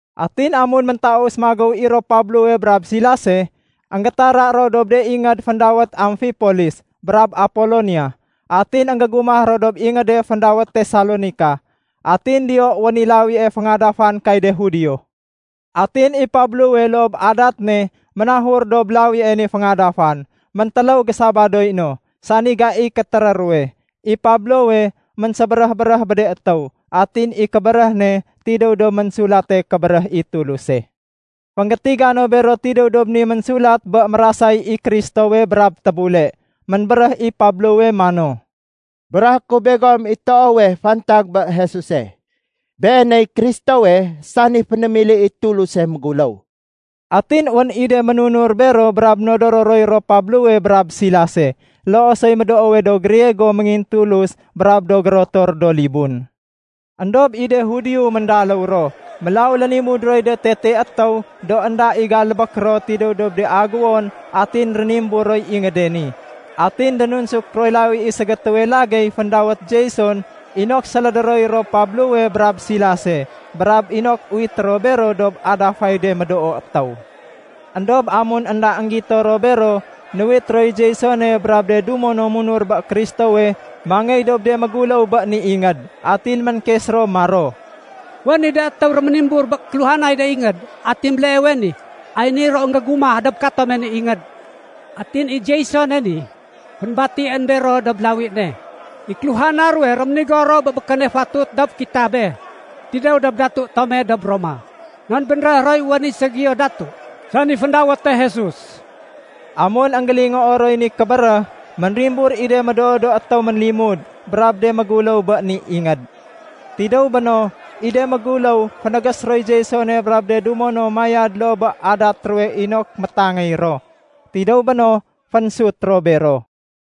Atin amun méntaus magéw i ro Pablowe brab Silase, énggétara ro dob de ingéd féndawét Amfipolis brab Apolonia, atin énggégumah ro dob ingéde féndawét Tesalonika. Atin diyo wén i lawie féngadafan kay de Judio. Atin i Pablowe loo bé adat ne ménahur dob lawie ni féngadafan. Méntéléw gé-Sabadoy no, sani gaiy kétéré ruwe, i Pablowe ménsébéréh-béréh bé de étéw atin i kébéréh ne tidéw dob Ménsulate Kébéréh i Tuluse. Fénggétiga no bero tidéw dob ni ménsulat bé mérasay i Kristowe brab tébule. Ménbéréh i Pablowe mano, “Béréhé ku begom i toowe fantag bé Jesuse. Beeney Kristowe, sani fénémili i Tuluse méguléw.” Atin wén i de ménunur bero brab nodoro roy ro Pablowe brab Silase. Loo soy médoowe do Griego méngintulus brab do gérotor do libun. Endob i de Judio méndaléw ro, mélaw lénimud roy de tete étéw do énda i galbék ro tidéw dob de aguwon atin rénimbur roy ingéde ni. Atin dénunsuk roy lawi i ségétéwe lagéy féndawét Jason inok sélédé roy ro Pablowe brab Silase, brab inok uwité ro bero dob adafay de médoo étéw. Endob amun énda énggito ro bero, nuwit roy Jasone brab de dumo no munur bé Kristowe mangéy dob de méguléw bé ni ingéd. Atin ménkes ro maro, “Wén i de étéw réménimbur bé kéluhanay de ingéd. Atin béleewe ni, ay ni ro énggégumah dob katome ni ingéd. Atin i Jasone ni, fénbatién bero dob lawi ne. I kéluhana ruwe réménigo ro bé békéne fatut dob kitabe tidéw dob Datu tome dob Roma. Non bénréh roy wén i ségiyo datu, sani féndawéte Jesus.” Amun énggélingoo roy ni kébéréh, ménrimbur i de médoo do étéw ménlimud brab de méguléw bé ni ingéd. Tidéw béno, i de méguléw fénégés roy Jasone brab de dumo no mayad loo bé adat ruwe inok métangéy ro. Tidéw béno fénsut ro bero.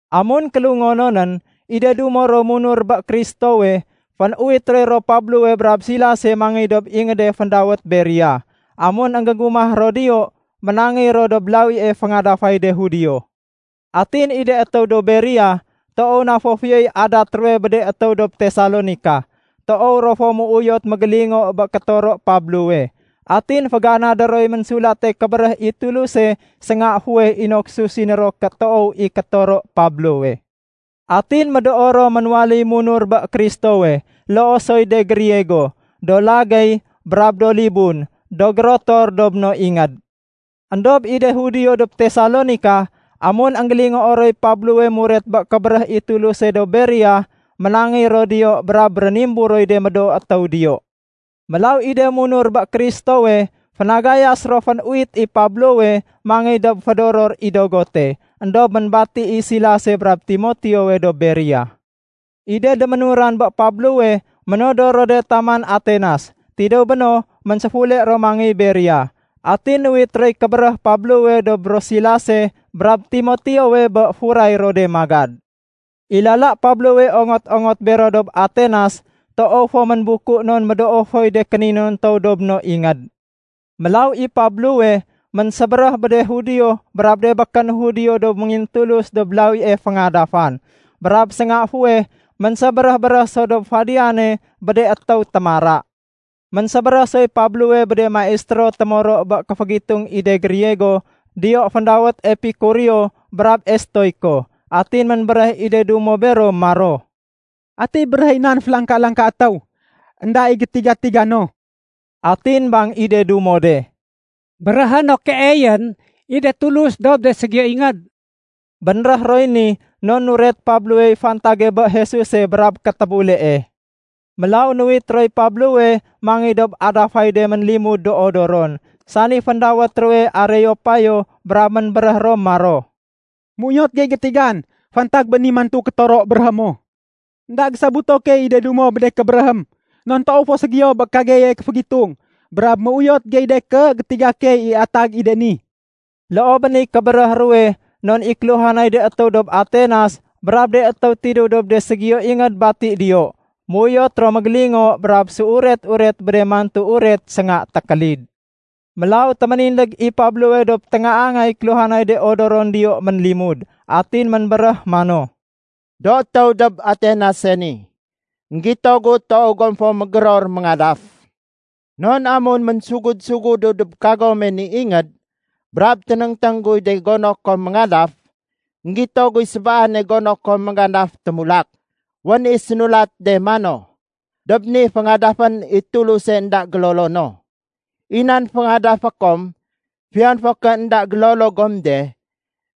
Amun kélungononén, i de dumo ro munur bé Kristowe, fénuwit roy Pablowe brab Silase mangéy dob ingéde féndawét Berea. Amun énggégumah ro diyo, ménangéy ro dob lawie féngadafay de Judio. Atin i de étéw dob Berea, toow na fo fiyoy adat ruwe bé de étéw dob Tesalonika. Toow ro fo méuyot mégélingo bé kétoro Pablowe. Atin féganadé roy Ménsulate Kébéréh i Tuluse sénga fuweh inok susiné ro ké toow i kétoro Pablowe. Atin médoo ro ménwaléy munur bé Kristowe. Loo soy de Griego, do lagéy brab do libun do gérotor dob no ingéd. Endob i de Judio dob Tesalonika, amun énggélingoo roy Pablowe muret bé kébéréh i Tuluse dob Berea, ménangéy ro diyo brab rénimbur roy de médoo étéw diyo. Mélaw i de munur bé Kristowe fénagayas ro fénuwit i Pablowe mangéy dob fédoror i dogote, éndob ménbati i Silase brab Timoteowe dob Berea. I de déménuran bé Pablowe ménodor ro de taman Atenas. Tidéw béno ménséfule ro mangéy Berea. Atin nuwit roy kébéréh Pablowe dob ro Silase brab Timoteowe bé furay ro de magad. I lala Pablowe ongot-ongot bero dob Atenas, toow fo ménbuku non médoo foy de kéninontow dob no ingéd. Mélaw i Pablowe ménsébéréh bé de Judio brab de békén do Judio do méngintulus dob lawie féngadafan. Brab sénga fuweh ménsébéréh-béréh so dob fadiyane bé de étéw témara. Ménsébéréh soy Pablowe bé de maistéro témoro bé kéfégitung i de Griego diyo féndawét Epikureo brab Estoiko. Atin ménbéréh i de dumo bero maro, “Ati béréhéy nan félangka-langka étéw énda i gétiga-tiga no?” Atin bang i de dumo de, “Béréhé no keeyén i de tulus dob de ségiyo ingéd.” Bénréh roy ni non nuret Pablowey fantage bé Jesuse brab kétébulee. Mélaw nuwit roy Pablowe mangéy dob adafay de ménlimud do odoron, sani féndawét ruwe Areopayo brab ménbéréh ro maro, “Méuyot gey gétigan fantag bé ni mantu kétoro béréhé mo. Enda gésobuto key i de dumo bé de kébéréhém non toow fo ségiyo bé kageye kéfégitung. Brab méuyot gey de ké gétiga key i atag i de ni.” (Loo bé niy kébéréh ruwe non i kéluhanay de étéw dob Atenas brab de étéw tidéw dob de ségiyo ingéd bati diyo, méuyot ro mégélingo brab séuret-uret bé de mantu uret sénga tékélid.) Mélaw téménindég i Pablowe dob téngaangay kéluhanay de odoron diyo ménlimud. Atin ménbéréh mano, “Do étéw dob Atenase ni, énggito gu toow gom fo mégéror méngadaf. Non amun ménsugud-sugudu dob kagome ni ingéd brab ténéngténg guy de gono kom méngadaf, énggito guy sébaane gono kom méngadaf témulak. Wén i sénulate de mano, ‘Dob ni, féngadafén i tuluse énda gélolono.’ I nan féngadafé kom fiyon fo ké énda gélolo gom de,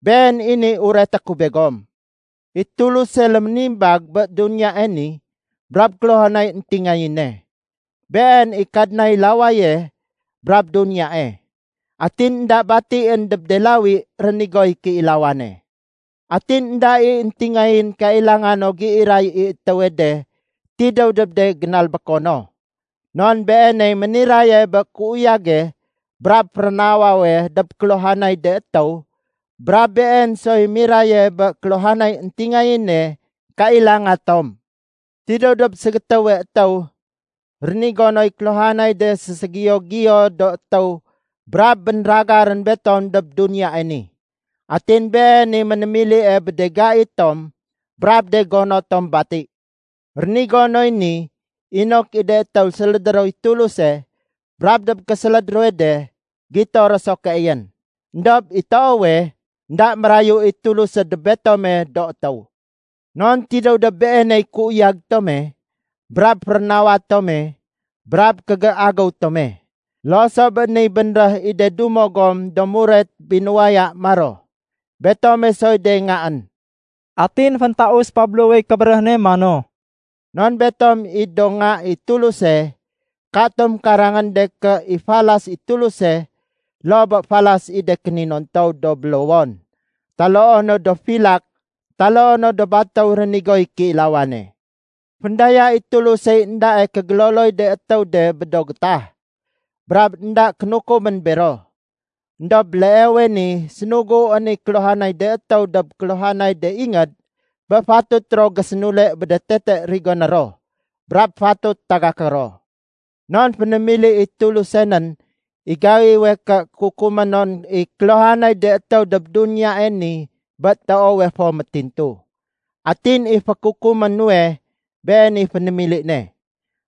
Been i ni ureté ku begom. I Tuluse léménimbag bé duniyae ni brab kéluhanay éntingayéne. Been i Kadnay lawaye brab duniyae. Atin énda batién dob de lawi rénigoy kéilawane. Atin énda i éntingayén kailanga no géiray i étéwe de tidéw dob de génalbéko no. Non Beeney méniraye bé kéuyage brab férénawawe dob kéluhanay de étéw brab Been soy miraye bé kéluhanay éntingayéne kailanga tom. Tidéw dob ségétéwe étéw, rénigo noy kéluhanay de séségiyo-giyo do étéw brab bénragarén betom dob duniyae ni. Atin Been i ménémilie bé de gai tom brab de gono tom bati. Rénigo noy ni inok i de étéw sélédé roy Tuluse brab dob késéléd ruwe de, gito ro so keeyén. Endob i toowe, énda mérayu i Tuluse dob betome do étéw. ‘Non tidéw dob Beeney kéuyag tome brab férénawa tome brab kégéagéw tome.’ Loo so bé niy bénréh i de dumo gom do muret binuwaya maro, ‘Betome soy de ngaén.’” Atin féntaus Pablowey kébéréh ne mano, “Non betom i do nga i Tuluse, katom karangén de ké i falas i Tuluse loo bé falas i de kéninontow do bélowon taloo no do filak taloo no do batéw rénigoy kéilawane. Féndaya i Tulusey éndae kégéloloy de étéw de bé do gétah, brab énda kénukumén bero. Endob béleewe ni sénuguén i kéluhanay de étéw dob kéluhanay de ingéd bé fatut ro gésénule bé de tete rigoné ro brab fatut tagaké ro. Non fénémili i Tuluse nén i gaiwe ké kukumé non i kéluhanay de étéw dob duniyae ni bé toowe fo métintu. Atin i fékukumé nuwe Been i fénémili ne.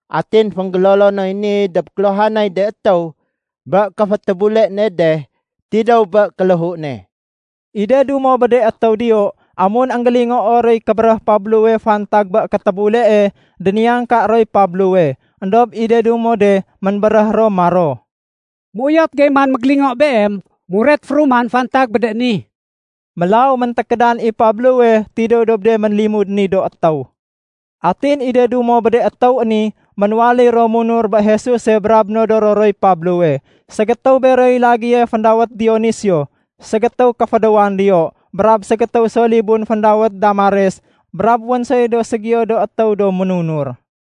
Atin fénggélolo noy ni dob kéluhanay de étéw bé kéfétébule ne de tidéw bé kéléhu ne.” I de dumo bé de étéw diyo, amun énggélingoo roy kébéréh Pablowe fantag bé kétébulee, déniyangka roy Pablowe. Endob i de dumo de ménbéréh ro maro, “Méuyot gey man mégélingo beem muret féruman fantag bé de ni.” Mélaw méntékédan i Pablowe tidéw dob de ménlimud ni do étéw. Atin i de dumo bé de étéw ni ménwaléy ro munur bé Jesuse brab nodoro roy Pablowe. Ségétéw beroy lagéye féndawét Dionisio, ségétéw kéfédéwan diyo. Brab ségétéw so libun féndawét Damares brab wén soy do ségiyo do étéw do ménunur.